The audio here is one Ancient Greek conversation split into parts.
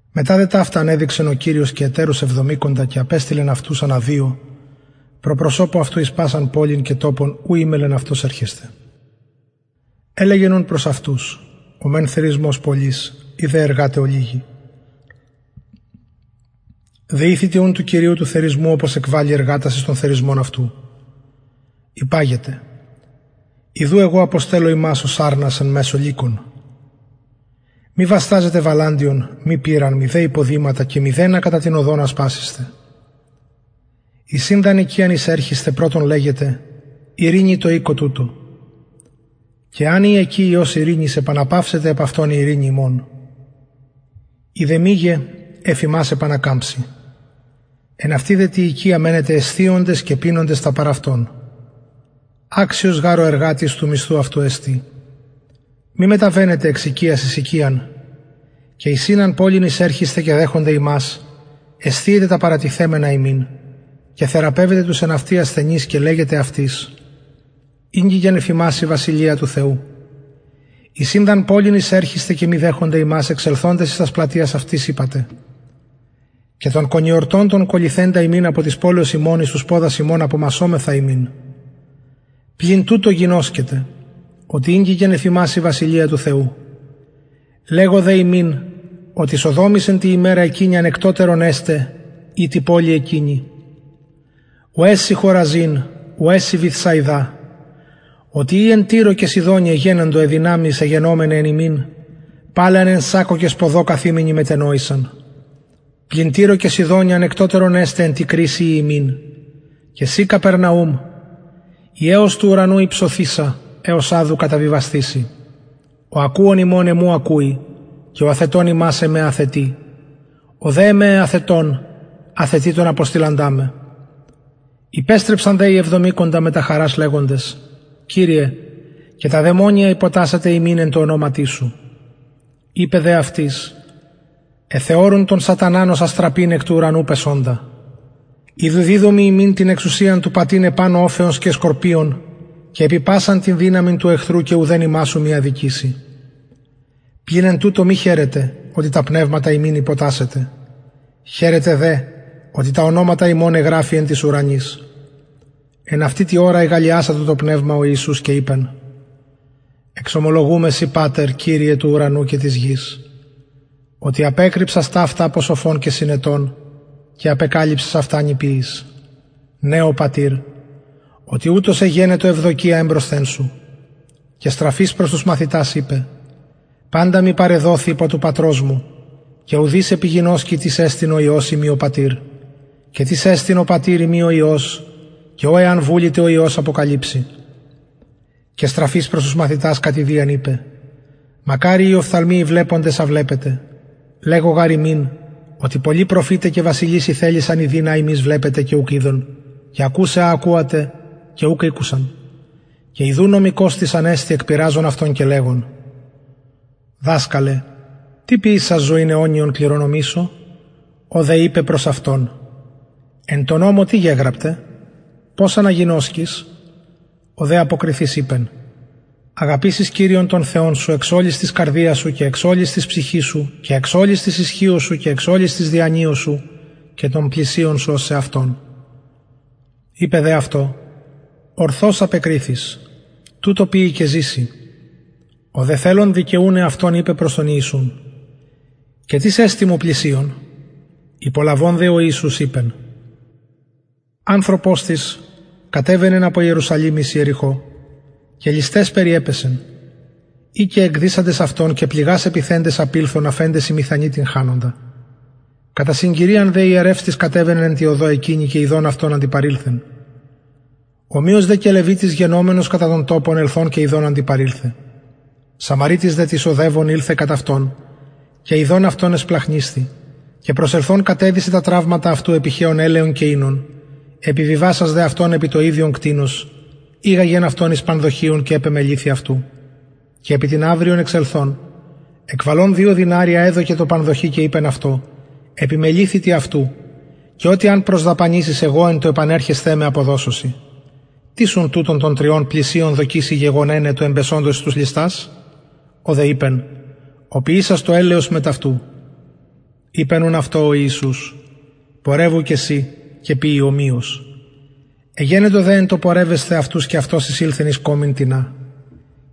μετα δε ταυτα ανεδειξεν ο κυριος και ετερους εβδομηκοντα και απεστειλεν αυτους ανα δυο προ προσωπου αυτου εις πασαν πολιν και τοπον ου εμελλεν αυτος ερχεσθαι ελεγεν ουν προς αυτους ο μεν θερισμος πολυς οι δε εργαται ολιγοι δεηθητε ουν του κυριου του θερισμου οπως εκβαλη εργατας εις τον θερισμον αυτου υπαγετε ιδου εγω αποστελλω υμας ως αρνας εν μεσω λυκων μη βασταζετε βαλαντιον μη πηραν μηδε υποδηματα και μηδενα κατα την οδον ασπασησθε εις ην δ αν οικιαν εισερχησθε πρωτον λεγετε ειρηνη τω οικω τουτω και εαν η εκει υιος ειρηνης επαναπαυσεται επ αυτον η ειρηνη υμων ει δε μηγε εφ υμας ανακαμψει εν αυτη δε τη οικια μενετε εσθιοντες και πινοντες τα παρ αυτων αξιος γαρ ο εργατης του μισθου αυτου εστιν μη μεταβαινετε εξ οικιας εις οικιαν και εις ην αν πολιν εισερχησθε και δεχωνται υμας εσθιετε τα παρατιθεμενα υμιν και θεραπευετε τους εν αυτη ασθενεις και λεγετε αυτοις ηγγικεν εφ υμας η βασιλεια του θεου εις ην δ αν πολιν εισερχησθε και μη δεχωνται υμας εξελθοντες εις τας πλατειας αυτης ειπατε και τον κονιορτον τον κολληθεντα ημιν εκ της πολεως υμων απομασσομεθα υμιν πλην τουτο γινωσκετε οτι ηγγικεν εφ υμας η βασιλεια του θεου λεγω υμιν οτι σοδομοις εν τη ημερα εκεινη ανεκτοτερον εσται η τη πολει εκεινη ουαι σοι χοραζιν ουαι σοι βηθσαιδα οτι ει εν τυρω και σιδωνι εγενοντο αι δυναμεις αι γενομεναι εν υμιν παλαι αν εν σακκω και σποδω καθημεναι μετενοησαν πλην τυρω και σιδωνι ανεκτοτερον εσται εν τη κρισει η υμιν και συ καπερναουμ η εως του ουρανου υψωθεισα εως αδου καταβιβασθηση ο ακουων υμων εμου ακουει και ο αθετων υμας εμε αθετει ο δε εμε αθετων αθετει τον αποστειλαντα με υπεστρεψαν δε οι εβδομηκοντα μετα χαρας λεγοντες κυριε και τα δαιμονια υποτασσεται ημιν εν τω ονοματι σου ειπεν δε αυτοις εθεωρουν τον σαταναν ως αστραπην εκ του ουρανου πεσοντα ιδου διδωμι υμιν την εξουσιαν του πατειν επανω οφεων και σκορπιων και επι πασαν την δυναμιν του εχθρου και ουδεν υμας ου μη αδικηση πλην εν τουτω μη χαιρετε οτι τα πνευματα υμιν υποτασσεται χαιρετε δε οτι τα ονοματα υμων εγραφη εν τοις ουρανοις εν αυτη τη ωρα ηγαλλιασατο τω πνευματι ο ιησους και ειπεν εξομολογουμαι σοι πατερ κυριε του ουρανου και της γης οτι απεκρυψας ταυτα απο σοφων και συνετων και απεκαλυψας αυτα νηπιοις ναι ο πατηρ οτι ουτως εγενετο ευδοκια εμπροσθεν σου και στραφεις προς τους μαθητας ειπεν παντα μοι παρεδοθη υπο του πατρος μου και ουδεις γινωσκει τις εστιν ο υιος ει μη ο πατηρ και τις εστιν ο πατηρ ει μη ο υιος και ω εαν βουληται ο υιος αποκαλυψαι και στραφεις προς τους μαθητας κατ ιδιαν ειπεν μακαριοι οι οφθαλμοι οι βλεποντες α βλεπετε λεγω γαρ υμιν οτι πολλοι προφηται και βασιλεις ηθελησαν ιδειν α υμεις βλεπετε και ουκ ειδον και ακουσαι α ακουετε και ουκ ηκουσαν και ιδου νομικος τις ανεστη εκπειραζων αυτον και λεγων διδασκαλε τι ποιησας ζωην αιωνιον κληρονομησω ο δε ειπεν προς αυτον εν τω νομω τι γεγραπται πως αναγινωσκεις ο δε αποκριθεις ειπεν αγαπησεις κυριον τον θεον σου εξ ολης της καρδιας σου και εξ ολης της ψυχης σου και εξ ολης της ισχυος σου και εξ ολης της διανοιας σου και τον πλησιον σου ως σεαυτον ειπεν δε αυτω ορθως απεκριθης τουτο ποιει και ζηση ο δε θελων δικαιουν εαυτον ειπεν προς τον ιησουν και τις εστιν μου πλησιον υπολαβων δε ο ιησους ειπεν ανθρωπος τις κατεβαινεν απο ιερουσαλημ εις ιεριχω και λησταις περιεπεσεν οι και εκδυσαντες αυτον και πληγας επιθεντες απηλθον αφεντες ημιθανη τυγχανοντα κατα συγκυριαν δε ιερευς τις κατεβαινεν εν τη οδω εκεινη και ιδων αυτον αντιπαρηλθεν ομοιως δε και λευιτης γενομενος κατα τον τοπον ελθων και ιδων αντιπαρηλθεν σαμαρειτης δε τις οδευων ηλθεν κατ αυτον και ιδων αυτον εσπλαγχνισθη και προσελθων κατεδησεν τα τραυματα αυτου επιχεων ελαιον και οινον επιβιβασας δε αυτον επι το ιδιον κτηνος ηγαγεν αυτον εις πανδοχειον και επεμεληθη αυτου και επι την αυριον εξελθων εκβαλων δυο δηναρια εδωκεν τω πανδοχει και ειπεν αυτω επιμεληθητι αυτου και ο τι αν προσδαπανησης εγω εν τω επανερχεσθαι με αποδωσω σοι τις ουν τουτων των τριων πλησιον δοκει σοι γεγονεναι του εμπεσοντος εις τους ληστας ο δε ειπεν ο ποιησας το ελεος μετ αυτου ειπεν ουν αυτω ο ιησους πορευου και συ ποιει ομοιως εγενετο δε εν τω πορευεσθαι αυτους και αυτος εισηλθεν εις κωμην τινα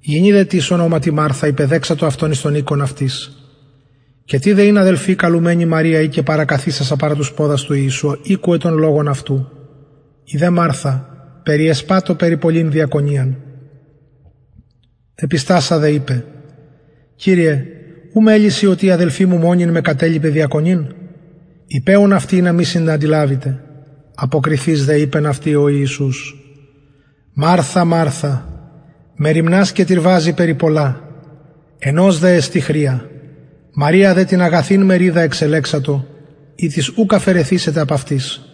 γυνη δε τις ονοματι μαρθα υπεδεξατο αυτον εις τον οικον αυτης και τηδε ην αδελφη καλουμενη μαρια η και παρακαθισασα παρα τους ποδας του ιησου ηκουεν τον λογον αυτου η δε μαρθα περιεσπατο περι πολλην διακονιαν επιστασα δε ειπεν κυριε ου μελει σοι οτι η αδελφη μου μονην με κατελειπεν διακονειν ειπε ουν αυτη ινα μοι συναντιλαβηται αποκριθεις δε ειπεν αυτη ο ιησους μαρθα μαρθα μεριμνας και τυρβαζη περι πολλα ενος δε εστιν χρεια μαρια δε την αγαθην μεριδα εξελεξατο ητις ουκ αφαιρεθησεται απ αυτης